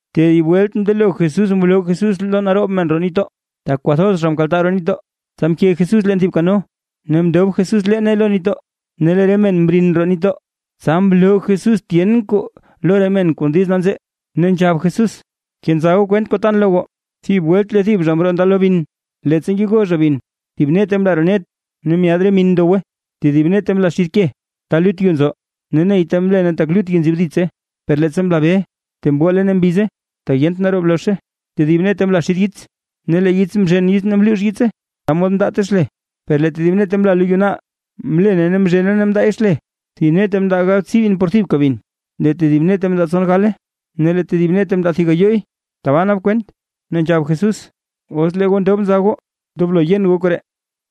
Tedib welt mndelo Jesús mloo Jesús lo naroob men roo nitdoo, tak kwathoz zha mkaltaa roo nitdoo, tsa mke Jesús leen thib kano, ne mndob Jesús leene lo nitdoo. Ne lee re men mrin roo nitdoo. Tsa mloo Jesús tyen kuu lo re men kon diiz nanzee. Ne nzhab Jesús: ―Kenza goo kwent kuu tan lo goo. Thib welt lee thib zha mroo ndalo bin. Leettsa ngego zha bin, thib nete mla roo net, ne myaad re min ndowe. Tedib nete mla xid ke, ta lut yu nzo. Ne neyta mlene tak lut yu nzib ditse. Per leettsa mla be, tee mgole ne mbize tak yent naroob lozhe. Tedib nete mla xid yits, ne lee yits mzhen ne mluux yitse, ta mod mndaate xle. Per lee tedib nete mla lo yu naal, mlene ne mzhene ne mndaay xle. Thib nete mndaa galbtsii bin por thibka bin, lee tedib nete mndaa tson gale, ne lee tedib nete mndaa thib gayooy. Tbaa nak kwent. Ne nzhab Jesús: ―¡Os lee goo ndob nza goo, ndoblo yen goo koree!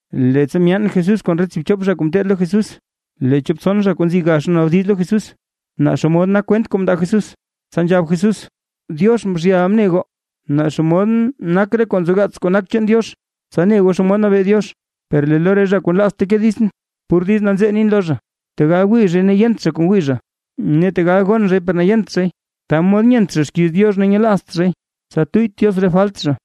Leettsa myaan Jesús kon re tsiibchop zha kuu ngeteed lo Jesús, lee chop tson zha kuu nzi gax mnaabdiz lo Jesús, naa xomod nak kwent kuu mndaa Jesús. Tsa nzhab Jesús: ―Diox mzhyal ne goo naa xomod nak re kuu nzogaats kuu nak chaan Diox, tsa ne goo xomod nabee Diox. Per lee lo re zha kuu nlaazt teke ditsʼn, pur diiz nanzee nin lo zha. Tegal wii zhay ne yent zha kuu ngwii zha, ne tegal gon zhay per yent zhay, ta mod nyent zha xkiiz Diox ne nyelaazt zhay, tsa tuyyt Diox re falt zha.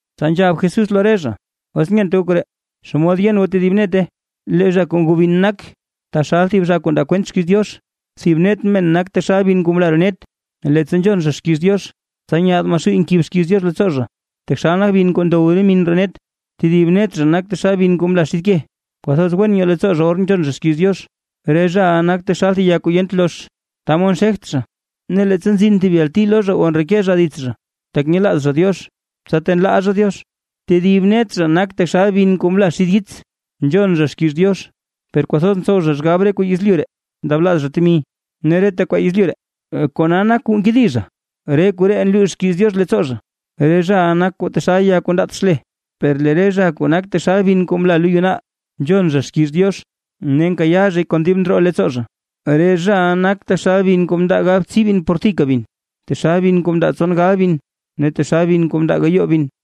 Tsa nzhab Jesús lo re zha: ―¿Os nyent goo koree? ¿Xomod yen goo tedib nete? Lee zha kuu ngoo bin nak taxal thib zha kuu ndaa kwent xkiiz Diox. Thib net men nak taxal bin kuu mla roo net. Leettsa nzhon zha xkiiz Diox, tsa nyaad Maxuuy nkib xkiiz Diox leettsoo zha, taxal nak bin kuu ndow min roo net. Tedib net zha nak taxal bin kuu mla xid ke, kwathoz wen nyoo leettsoo zha or nzhon zha xkiiz Diox. Re zhaʼa nak taxal thib ya kuu yent lozh, ta mod nxegt zha, ne leettsa nzin thib yalti lo zha o ndreke zha dits zha, tak nyelaaz zha Diox, tsa tee nlaa zha Diox. Tedib net zha nak taxal bin kuu mla xid yits, nzhon zha xkiiz Diox, per kwathoz ntsow zha xgab re kuu yezlyu ree, ndablaaz zha temi, ne reta kwaa yezlyu ree, kona nak kuu nkedi zha, re koree nluux xkiiz Diox leettsoo zha. Re zhaʼa nak taxal ya kuu ndaat xle. Per lee re zha kuu nak taxal bin kuu mla lo yu naal. Nzhon zha xkiiz Diox, ne nkayaa zhay kon dib ndroo leettsoo zha, re zhaʼa nak taxal bin kuu mndaa galbtsii bin por thibka bin, taxal bin kuu mndaa tson gal bin ne taxal bin kuu mndaa gayoo bin.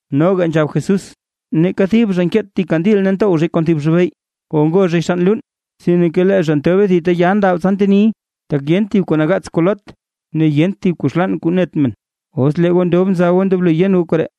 Noga nzhab Jesús: ―Neeka thib zha nkeet thib kandil ne ntow zhay kon thib zhibey, o ngoo zhay xann luun, sinke lee zha ntobe thib ta ya ndab, tsa nteniy. Tak yent thib kuu nagaats kuu loot, ne yent thib kuu xlaan kuu net men. ¡Os lee goo ndob nza goo ndoblo yen goo koree!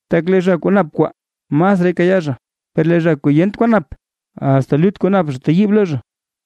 Tak lee zha kuu nap kwaa, masraay kayaa zha, per lee zha kuu yent kuu nap, asta lut kuu nap zha teyiibe lo zha.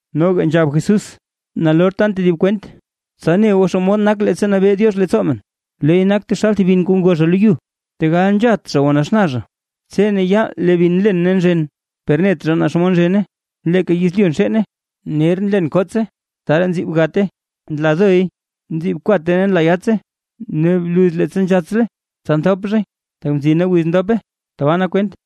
Noga nzhab Jesús: ―Nalor tan tedib kwent, tsa ne goo xomod nak leettsa nabee Diox leettsoo men, leey nak taxal thib bin kuu ngo zha lo yu. Tegal nzhat zha o naxna zha, tse ne yaal lee bin nlen ne nzhen, per net zha naa xomod nzhene. Leeka yezlyu nxeene. Ner nlen kottse, tsaraa nziib gatte, nla doy, nziib kwate ne nla yattse. Ne bluz leettsa nzhatslay, tsa nthop zhay, tak mzina wiz dope. Tbaa nak kwent.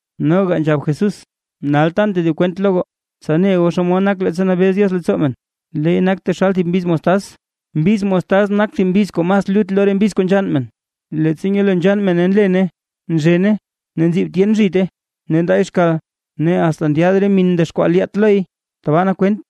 Noga nzhab Jesús: ―Nal tan tedib kwent lo goo, tsa ne goo xomod nak leettsa nabee Diox leettsoo men. Leey nak taxal thib mbiz mostaz, mbiz mostaz nak thib mbiz kuu mas lut lo re mbiz kuu nzhann men. Leettsa nyelo nzhann mene, nlene nzhene ne nziib tyen zhite, ne ndaay xkal, ne asta ndyaad re min ndexkwaa lyaat loy. Tbaa nak kwent.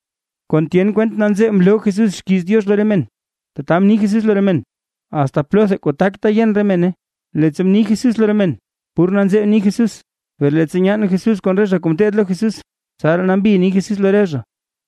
Kon tyen kwent nanzee mloo Jesús xkiiz Diox lo re men. Tata mni Jesús lo re men asta plotha kuu takta yen re mene. Leettsa ni Jesús lo re men pur nanzee ni Jesús, per leettsa nyaan Jesús kon re zha kuu ngeteed lo Jesús, tsaraa nambi ni Jesús lo re zha.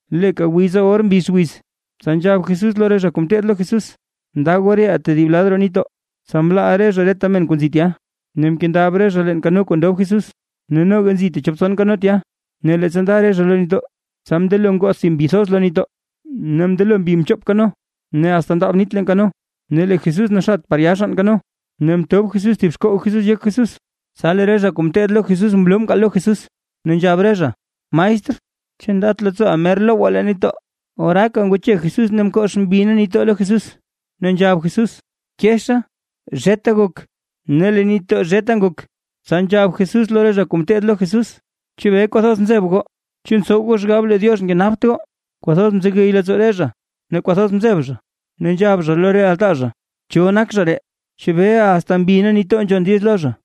Leeka wiza or mbix wiz, tsa nzhab Jesús lo re zha kuu ngeteed lo Jesús: ―Nda goo reʼaa tedib lad roo nitdoo. Tsa mlaa re zha reta men kuu nzi tya, ne mkendab re zha leen kano kuu ndob Jesús. Ne noga nzi techop tson kano tya. Ne leettsa nda re zha lo nitdoo, tsa mndelo ngoth thib mbi thoz lo nitdoo, ne mndelo mbi mchop mbi kano, ne asta ndaab nit leen kano. Ne lee Jesús naxat par ya xann kano, ne mtob Jesús thib xkoog Jesús yek Jesús. Tsa lee re zha kuu ngeteed lo Jesús mloo mkaal lo Jesús, ne nzhab re zha: ―Maestr, ¿chu ndat leettsooʼa mer lowgwaa leen nitdoo? Oraaka ngwache Jesús ne mkox mbi ne nitdoo lo Jesús, ne nzhab Jesús: ―¡Keeta bi! ¡Zheta gok! Ne lee nitdoo zheta ngok. Tsa nzhab Jesús lo re zha kuu ngeteed lo Jesús: ―¿Chebee kwathoz nzeb goo? ¿Chu ntsow goo xgab lee Diox nkenapt goo? Kwathoz mzegey leettsoo re zha ne kwathoz mzeb zha, ne nzhab zha lo re altaa zha: ―¿Cho nak zha ree? ¿Chebee asta mbi ne nitdoo nzhon diiz lo zha?